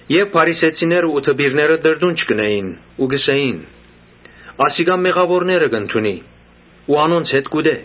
Իսկ փարիսեցիներ ու դպիրներ տրտունջ կ’ընէին ու կ’ըսէին. «Ասիկա մեղաւորները կ’ընդունի ու անոնց հետ կ’ուտէ»։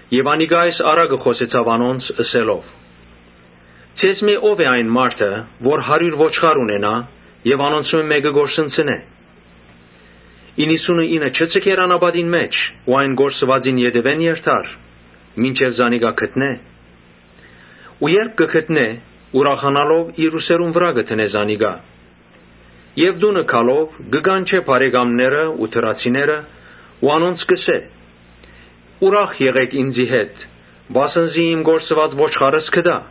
Յիսուս այս առակը խօսեցաւ անոնց՝ ըսելով. «Ձեզմէ ո՞վ է այն մարդը, որ եթէ հարիւր ոչխար ունենայ եւ անոնցմէ մէկը կորսնցնէ, իննսունըինը չի ձգեր անապատին մէջ ու այն կորսուածին ետեւէն երթար, մինչեւ զանիկա գտնէ։ Ու երբ գտնէ, ուրախանալով իր ուսերուն վրայ կը դնէ զանիկա Եւ տունը գալով, կը կանչէ բարեկամներն ու դրացիները ու անոնց կ’ըսէ. ‘Ուրախ եղէք ինծի հետ, վասն զի իմ կորսուած ոչխարս գտայ’։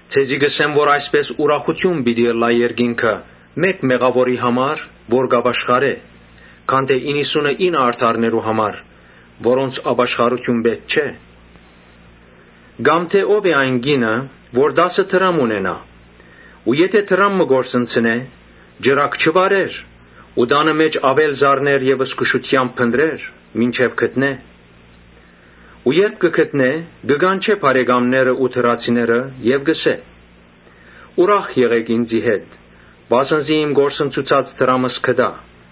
Ձեզի կ’ըսեմ թէ այսպէս աւելի ուրախութիւն պիտի ըլլայ երկինքը մէկ մեղաւորի համար, որ կ’ապաշխարէ, քան թէ իննսունըինը արդարներու համար՝ որոնց ապաշխարութիւն պէտք չէ»։ «Կամ թէ ո՞վ է այն կինը որ տասը դրամ ունենայ ու դրամ մը կորսնցնէ, ճրագ չի վառեր ու տանը մէջ աւել զարներ եւ զգուշութեամբ փնտռեր, մինչեւ գտնէ։ Ու երբ գտնէ, կը կանչէ բարեկամներն ու դրացիները եւ կ’ըսէ. ‘Ուրախ եղէք ինծի հետ, վասն զի իմ կորսնցուցած դրամս գտայ’։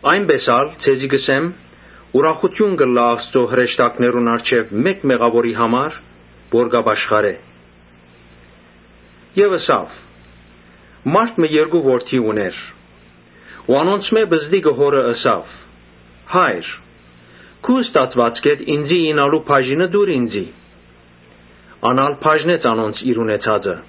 Այնպէս ալ, ձեզի կ’ըսեմ, ուրախութիւն կ’ըլլայ Աստուծոյ հրեշտակներուն առջեւ մէկ մեղաւորի համար, որ կ’ապաշխարէ»։ Ապա ըսաւ. «Մարդ մը երկու որդի ունէր. Անոնցմէ պզտիկը հօրը ըսաւ. ‘Հա՛յր, քու ստացուածքէդ ինծի իյնալու բաժինը տուր ինծի’։ Ան ալ բաժնեց անոնց իր ունեցածը։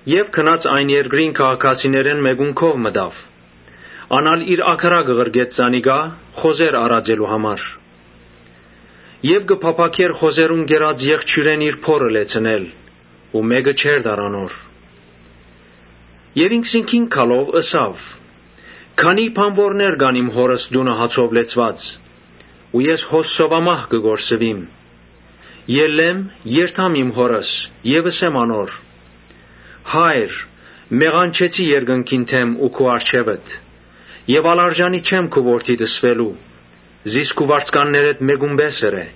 Ուստի գնաց այն երկրին քաղաքացիներէն մէկուն քով մտաւ։ Ան ալ իր ագարակը ղրկեց զանիկա՝ խոզեր արածելու համար։ Հոն կը փափաքէր խոզերուն կերած եղջիւրէն իր փորը լեցնել, բայց մէ՛կը չէր տար անոր։ Այն ատեն ինքզինքին գալով՝ ըսաւ. ‘Քանի՜ բանուորներ կան իմ հօրս տունը հացով լեցուած, ես հոս սովամահ կը կորսուիմ։ Ելլեմ, երթամ իմ հօրս եւ ըսեմ անոր. «Հա՛յր, մեղանչեցի երկնքի դէմ ու քու առջեւդ, Ա՛լ արժանի չեմ քու որդիդ ըսուելու, զիս քու վարձկաններէդ մէկուն պէս ըրէ’»։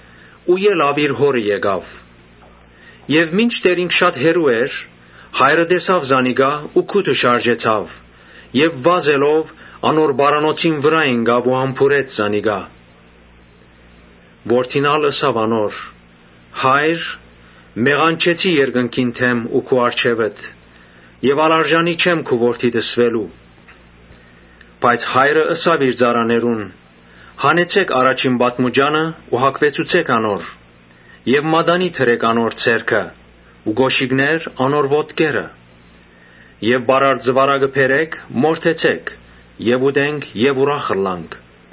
Ու ելաւ իր հօրը գնաց։ Մինչդեռ ինք շատ հեռու էր, հայրը տեսաւ զանիկա ու գութը շարժեցաւ եւ վազելով՝ անոր պարանոցին վրայ ինկաւ ու համբուրեց զանիկա։ Որդին ալ ըսաւ անոր. ‘Հա՜յր, մեղանչեցի երկնքի դէմ ու քու առջեւդ եւ ա՛լ արժանի չեմ քու որդիդ ըսուելու’։ Բայց հայրը ըսաւ իր ծառաներուն. ‘Հանեցէք առաջին պատմուճանը ու հագցուցէք անոր եւ մատանի դրէք անոր ձեռքը ու կօշիկներ՝ անոր ոտքերը Եւ պարարտ զուարակը բերէք, մորթեցէք, ուտենք եւ ուրախ ըլլանք.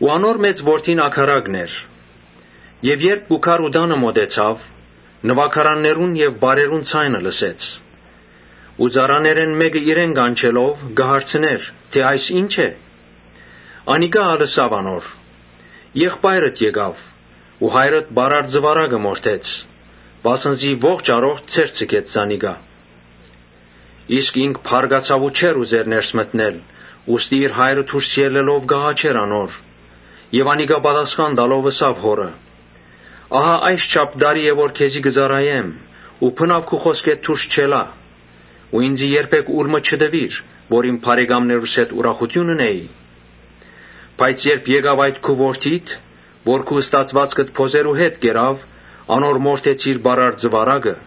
Անոր մեծ որդին ագարակն էր, երբ եկաւ ու տանը մօտեցաւ, նուագարաններու եւ պարերու ձայն լսեց։ Ծառաներէն մէկը իրեն կանչելով՝ հարցուց, թէ ‘Այս ի՞նչ է’։ Անիկա ալ ըսաւ անոր. ‘Եղբայրդ եկաւ ու հայրդ պարարտ զուարակը մորթեց, վասն զի ողջ առողջ ձեռք ձգեց զանիկա’։ Իսկ ինք բարկացաւ ու չէր ուզեր ներս մտնել, ուստի իր հայրը դուրս ելլելով կ’աղաչէր անոր։ Անիկա պատասխան տալով՝ ըսաւ հօրը. ‘Ահա այսչափ տարի է, որ քեզի կը ծառայեմ ու բնաւ քու խօսքէդ դուրս չելայ ու ինծի երբեք ուլ մը չտուիր, որ իմ բարեկամներուս հետ ուրախութիւն ընէի։ Բայց երբ եկաւ այդ քու որդիդ, որ քու ստացուածքդ բոզերու հետ կերաւ, անոր մորթեցիր պարարտ զուարակը’։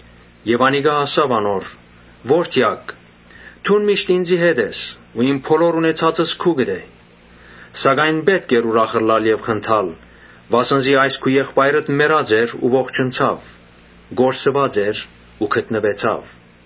Եւ հայրը ըսաւ անոր. ‘Որդեակ, դուն միշտ ինծի հետ ես ու իմ բոլոր ունեցածս քուկդ է։ Սակայն պէտք է ուրախ ըլլալ եւ խնդալ, վասն զի այս քու եղբայրդ մեռած էր ու ողջնցաւ, կորսուած էր ու գտնուեցաւ’»։